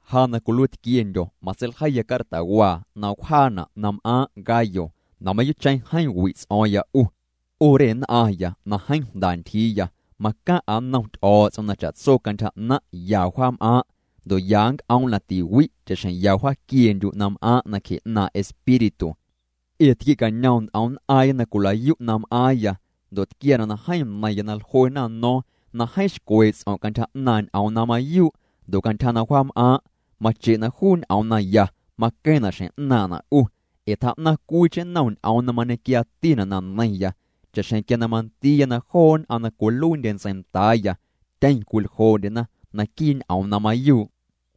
Ja na cwiluiitquiendyo̱, matseiljeiya cartawaa na wjaana' na m'aaⁿ' Gayo na mayuu'cheⁿ jeeⁿ wi' ts'o̱o̱ⁿya 'u. 'U re nn'aⁿya na jeeⁿ jnda ntyjiiya macaⁿ'a nnom Ty'o̱o̱ts'om na cha'tso cantyja 'naⁿ' ya wja'm'aaⁿ', ndo' ya nc'oom' na tiwi' cha'xjeⁿ ya wjaaquiendyu' na m'aaⁿ' nacje 'naaⁿ' Espíritu. Ee tquiecañom nt'om nn'aaⁿya na cwila'yu' na m'aaⁿya, ndo' tquiaana' na jeeⁿ neiⁿya na jluena no̱o̱ⁿ na jeeⁿ xcwee' ts'om' cantyja 'naaⁿ' ñ'oom na mayuu' ndo' cantyja na wjaam'aaⁿ', mache' na juu ñ'oom naya maqueⁿna' xjeⁿ 'naaⁿ'na' 'u. Ee tjaa'naⁿ cwiicheⁿ nnom ñ'oom na mañequiaatina' na neiⁿya cha'xjeⁿ quia na mandiiya na joo nn'aⁿ na cwiluiindye ntseindaaya tyeⁿ cwiljoo'ndyena naquii' ñ'oom na mayuu'.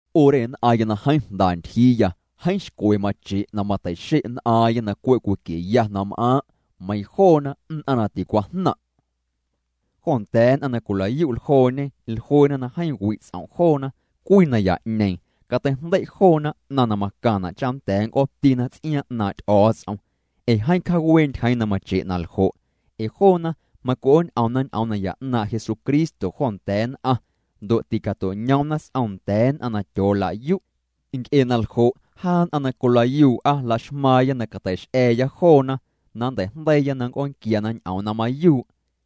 'U re nn'aⁿya na jeeⁿ jnda ntyjiiya, jeeⁿ xcwe mache' na mateixe' nn'aaⁿya na cwe' cwiquieya na m'aaⁿ', meiiⁿ joona nn'aⁿ na ticwajnaⁿ'. Jo nda̱a̱ nn'aⁿ na cwila'yu' ljooñe, jluena na jeeⁿ wi' ts'om' joona. Cwii naya'ñeeⁿ cateijndei' joona 'naⁿ na macaⁿna' cha nnda̱a̱ nc'ootina ts'iaaⁿ 'naaⁿ' Ty'o̱o̱ts'om, ee jeeⁿ cjawee' ntyjeeⁿ na mache' naljo'. Ee joona macwi'ooñ'omna ñ'oom naya 'naaⁿ' Jesucristo jo nda̱a̱ nn'aⁿ, ndo' tîcato'ñoomna s'om nda̱a̱ nn'aⁿ na tyoolayu'. Nc'e na ljo', jaa nn'aⁿ na cwilayuu'a la'xmaaⁿya na cateix'a̱a̱ya joona na nnteijndeiiya na cwi'oonquiana ñ'oom na mayuu'.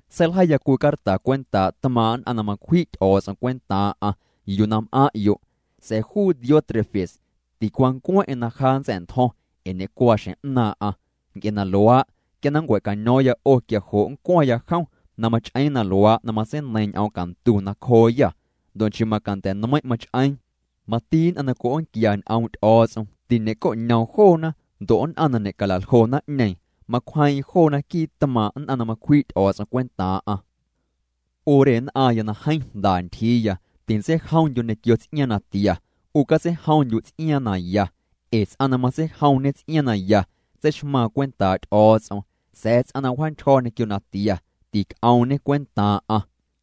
Seiljeiya cwii carta cwentaa' tmaaⁿ' nn'aⁿ na macwji' Ty'o̱o̱ts'om cwentaaⁿ'aⁿ yuu na m'aⁿ'yo' sa̱a̱ juu Diótrefes ticwancueⁿ'eⁿ na ja nntsa̱'ntjo̱ⁿ ee ñecuaa xjeⁿ 'naaⁿ'aⁿ. Nc'e na luaa', quia na nncua̱caño̱o̱ⁿya 'o, quia jo' ncwaⁿya jom na mach'eeⁿ na luaa' na matseineiiⁿ ñ'oom cantu nacjooyâ. Ndo' nchii macanda̱ nmeiⁿ' mach'eeⁿ, mati nn'aⁿ na cwi'oonquia ñ'oom' Ty'o̱o̱ts'om, tiñe'coñoom joona, ndo' nn'aⁿ na ñe'cala'ljo naⁿ'ñeeⁿ, macwjeeⁿ'eⁿ joona quii' tmaaⁿ' nn'aⁿ na macwji' Ty'o̱o̱ts'om cwentaaⁿ'aⁿ. 'U re nn'aⁿya na jeeⁿ jnda ntyjiiya, tintseijomndyu' ñequio ts'iaaⁿ natia, 'u catseijomndyu' ts'iaaⁿ na ya. Ee ts'aⁿ na matseijomñe ts'iaaⁿ na ya tseixmaaⁿ cwentaa' Ty'o̱o̱ts'om, sa̱a̱ ts'aⁿ na wjaantyjo̱ ñequio natia, tic'oomñe cwentaaⁿ'aⁿ.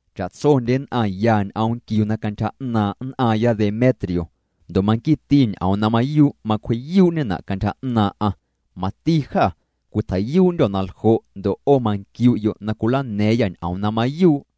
Cha'tsondye nn'aⁿ ya ñ'oom nquiuna cantyja 'naaⁿ' nn'aaⁿya Demetrio, ndo' manquiiti ñ'oom na mayuu' macwji'yuu'ñena' cantyja 'naaⁿ'aⁿ. Mati jâ cwitjei'yuu'ndyô̱ na ljo' ndo' 'o manquiu'yo' na cwilana̱a̱ⁿyâ ñ'oom na mayuu'.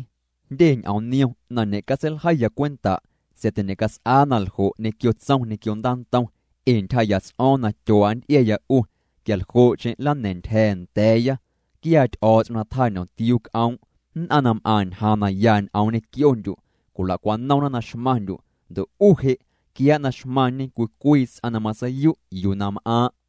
Jndye ñ'oom niom na ñe'catseiljeiya cwenta' sa̱a̱ tiñe'cats'aa naljo' ñequio tsom ñequio ndaantom, ee ntyjaa'ya ts'o̱o̱ⁿ na tyuaa' nnty'iaya 'u quialjo'cheⁿ nlana̱a̱ⁿ ntyja̱a̱ nda̱a̱ya. Quiaa Ty'o̱o̱ts'om na tjaañomtiuu c'oom'. Nn'aⁿ na m'aⁿ ñjaaⁿ na ya ñ'oom ñequiondyu' cwila'cwanomna na xmaⁿndyu', ndo' 'u je', quiaa' na xmaⁿñe cwii cwii ts'aⁿ na matseiyu' yuu na m'aaⁿ'.